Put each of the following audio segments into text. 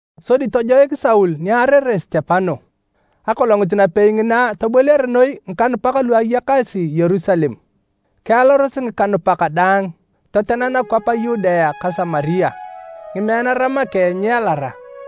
Sodi tojoik Saul ni aarere Sitepano. Aboliar Saul ngikanupak Akolongit napei ngina toboliare noi ngikanupak lu ayakasi Yerusalem. Kialaros ngikanupak daang totena nakwap a Yudea ka Samaria. Ngimeanara make nyialara.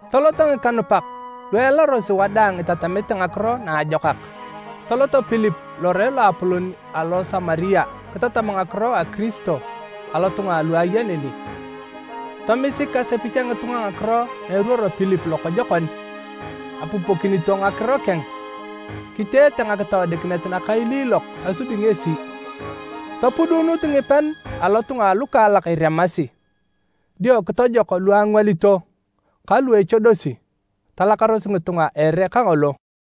Toloto ngikanupak lu ealarosi wadaang itatamete Ngakiro Naajokak. Tolot Pilip lore loapolon alo Samaria kitatam ngakiro a Kiristo alotunga alu aya neni. Tomisik asepich a ngitunga ngakiro na eruoro Pilip lokojokon, apupokinito ngakiro keng, kiteete ngakitoodikinet nakailiilok asubi ngesi. Topuduunut ngipean alotunga alukaalak iremasi, dio kitojok lu angwalito ka lu echodosi. Talakaros ngitunga a ere kangolo.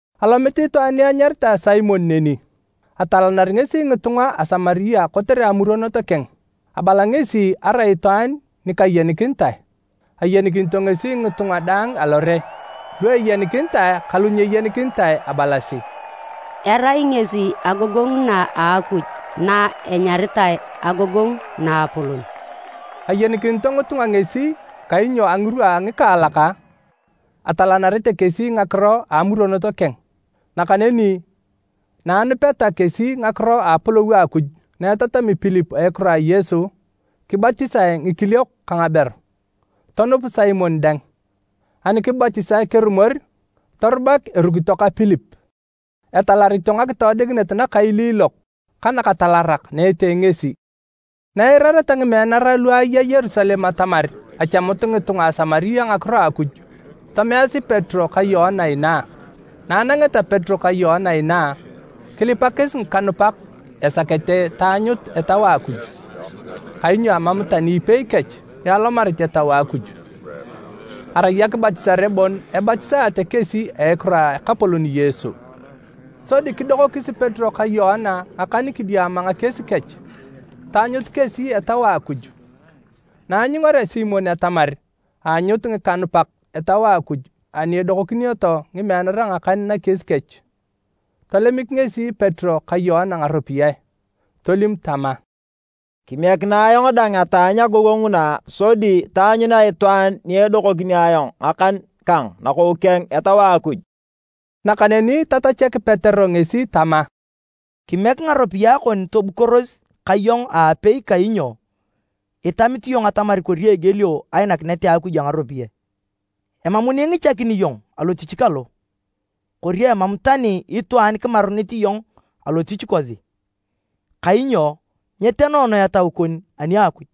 Alomit itwaan ni anyaritae Simon neni, atalanari ngesi ngitunga a Samaria kotere amuronot keng. Abala ngesi arai itwaan ni kayenikinitae, ayenikinito ngesi ngitunga daang alore, lu eyenikinitae ka lu nyeyenikinitae, abalasi, “Erai ngesi agogongu na a Akuj na enyaritae, ‘Agogongu Naapolon.’” Ayenikinito ngitunga ngesi kainyo a ngirwa a ngikaalak, atalanarete kesi ngakiro a amuronot keng. Nakaneni na anupeta kesi ngakiro a Apolou a Akuj na etatami Pilip a ekiro a Yesu, kibatisae ngikiliok ka ngaberu. Tonup Simon dang. Ani kibatisae kerumor, torubak erukito ka Pilip, etalarito ngakitoodikinet nakailiilok ka nakatalarak na etee ngesi. Na eirareta ngimeanara lu aya Yerusalem atamar achamut ngitunga a Samaria ngakiro a Akuj, tomeasi Petero ka Yoana inaa. Na anangeta Petero ka Yoana inaa, kilipakis ngikanupak esakete taanyut Etau a Akuj. Kainyo amam tani ipei kech ni alomarit Etau a Akuj. Arai akibatisare bon ebatisatae kesi a ekiro a Ekapolon Yesu. Sodi kidokokis Petero ka Yoana ngakan kidiama ngakies kech, taanyut kesi Etau a Akuj. Na anyungarea Simon atamar aanyut ngikanupak Etau a Akuj ani edokonokinioto ngimeanara ngakan nakies kech, tolemik ngesi Petero ka Yoana ngaropiyae, tolim tama, “Kimiekinae ayong dang ataanyu agogongu na sodi taanyunea itwaan ni edokokini ayong ngakan kang nakou keng Etau a Akuj.” Nakaneni tatachak Petero ngesi tama, “Kimiek ngaropiyae kon tobukoros ka iyong aapei kainyo itamit iyong atamar kori egielio ainakinet a Akuj a ngaropiyae! Emam ni ingichakin iyong alotich kalo, kori emam tani itwaan kimarunit iyong alotich kosi kainyo nyetenoono etau kon ani a Akuj.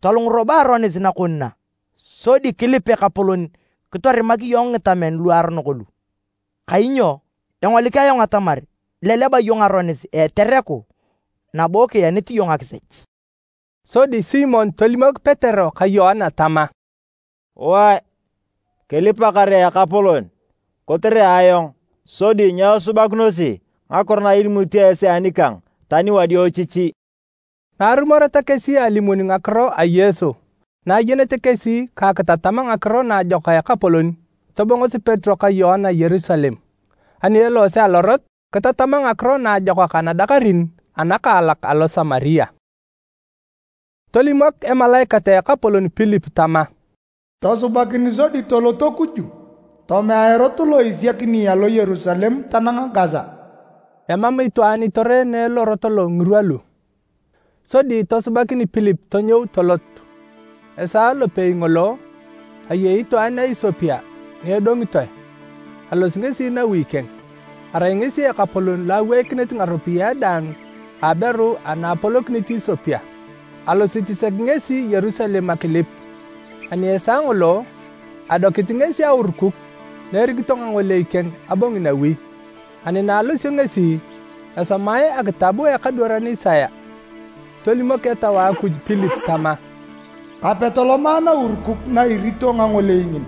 Tolung robo aronis nakon na sodi kilip Ekapolon kitorimak iyong ngitamen luaronok lu. Kainyo engolik ayong atamar ileleba iyong aronis a etereku nabo kienit iyong akisech.” Sodi Simon tolimok Petero ka Yoana tama, “Wae, kilipa kare Ekapolon kotere ayong sodi nyesubakinosi ngakiro na ilimut esi anikang tani wadiochichi.” Na arumoreta kesi alimun ngakiro a Yesu na ayenete kesi ka akitatam Ngakiro Naajokak a Ekapolon, tobongosi Petero ka Yoana Yerusalem. Ani eloose alorot, kitatama Ngakiro Naajokak anadakarin anakaalak Alosamaria. Tolimok emalaikat a Ekapolon Pilip tama, “Tosubakin sodi tolot kuju, tomea erot lo isiakini alo Yerusalem tanang Gasa.” (Emam itwaan itoreene lorot lo ngirwa lu.) Sodi tosubakin Pilip tonyou tolot. Esaa lopei ngolo, ayei itwaan a Isopia ni edongitoe, alosi ngesi nawi keng. Arai ngesi ekapolon lo aweikinit ngaropiyae daang a aberu ana apolokinit Isopia. Alosit sek ngesi Yerusalem akilip, ani esaa ngolo, adokit ngesi aurukuk na erito ngangolei keng abongi nawi. Ani na alosio ngesi, esomae akitab a ekadwaran Isaya. Tolimok Etau a Akuj Pilip tama, “Kape toloma naurukuk na irito ngangolei ngin.”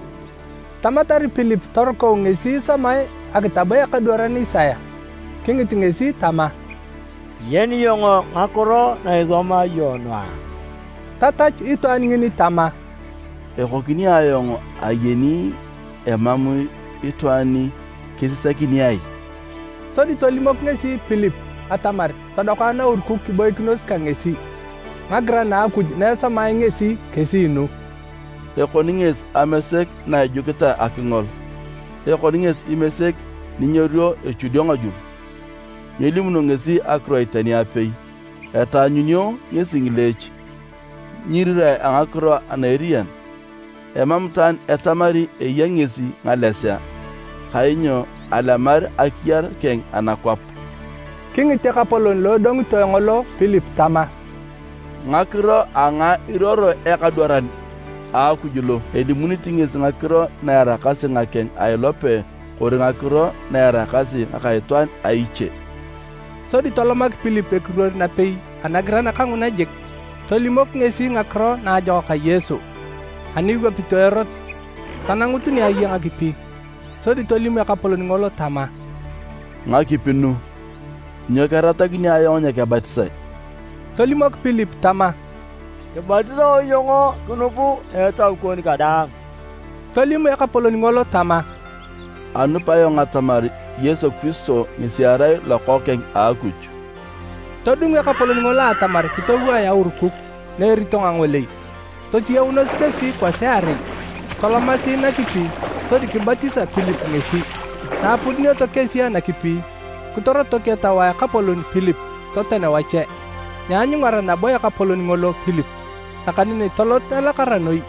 Tamatar Pilip torukau ngesi isomae akitab a ekadwaran Isaya. Kingit ngesi tama, “Iyeni iyong ngakiro na isomae iyong nu a?” Tatachu itwaan ngini tama, “Ekokini ayong ayeni emam itwaan ni kesisakini ai?” Sodi tolimok ngesi Pilip atamar todoka naurukuk kiboikinos ka ngesi. Ngagiran a Akuj na esomae ngesi kesi nu, “Ekoni ngesi amesek na ejukitae akingol, ekoni ngesi imesek ni nyeruo echudio ngajul. Nyelimuno ngesi akiroit tani apei. Etaanyunio ngesi ngileech, nyiirirae a ngakiro ana eriyan. Emam itwaan etamari eya ngesi ngalesea, kainyo alemar akiyar keng anakwap.” Kingit ekapolon lo edongitoe ngolo Pilip tama, “Ngakiro a ngae iruoro ekadwaran a Akuj lo? Elimunit ngesi ngakiro na eraakasi ngakeng a ilope kori ngakiro na eraakasi ngaka itwaan a iche?” Sodi tolomak Pilip ekiruor napei anagiran kanguna jik, tolimok ngesi Ngakiro Naajokak a Yesu. Ani iwapito erot, tanangut ni aya ngakipi sodi tolim ekapolon ngolo tama, “Ngakipi nu, nyoni keratakini ayong nyekebatisae?” [ Tolimok Pilip tama, “Kibatisao iyong kinup a etau kon kadaang.” Tolim Ekapolon ngolo tama, “Anup ayong atamar Yesu Kiristo ngesi erai Lokookeng a Akuj.”] Todung ekapolon ngolo atamar kitowae aurukuk na erito ngangolei. Totiyaunos kesi kwasiarei tolomasi nakipi sodi kibatisa Pilip ngesi. Na apudunioto kesi anakipi, kitorotok Etau a Ekapolon Pilip toten wache. Nyeanyungara nabo ekapolon ngolo Pilip, nakaneni tolot elakara noi.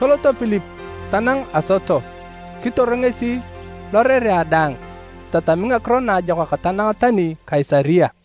Tolot Pilip tanang Asoto, kitor ngesi lorerea daang itatami Ngakiro Naajokak tanang tani Kaisaria.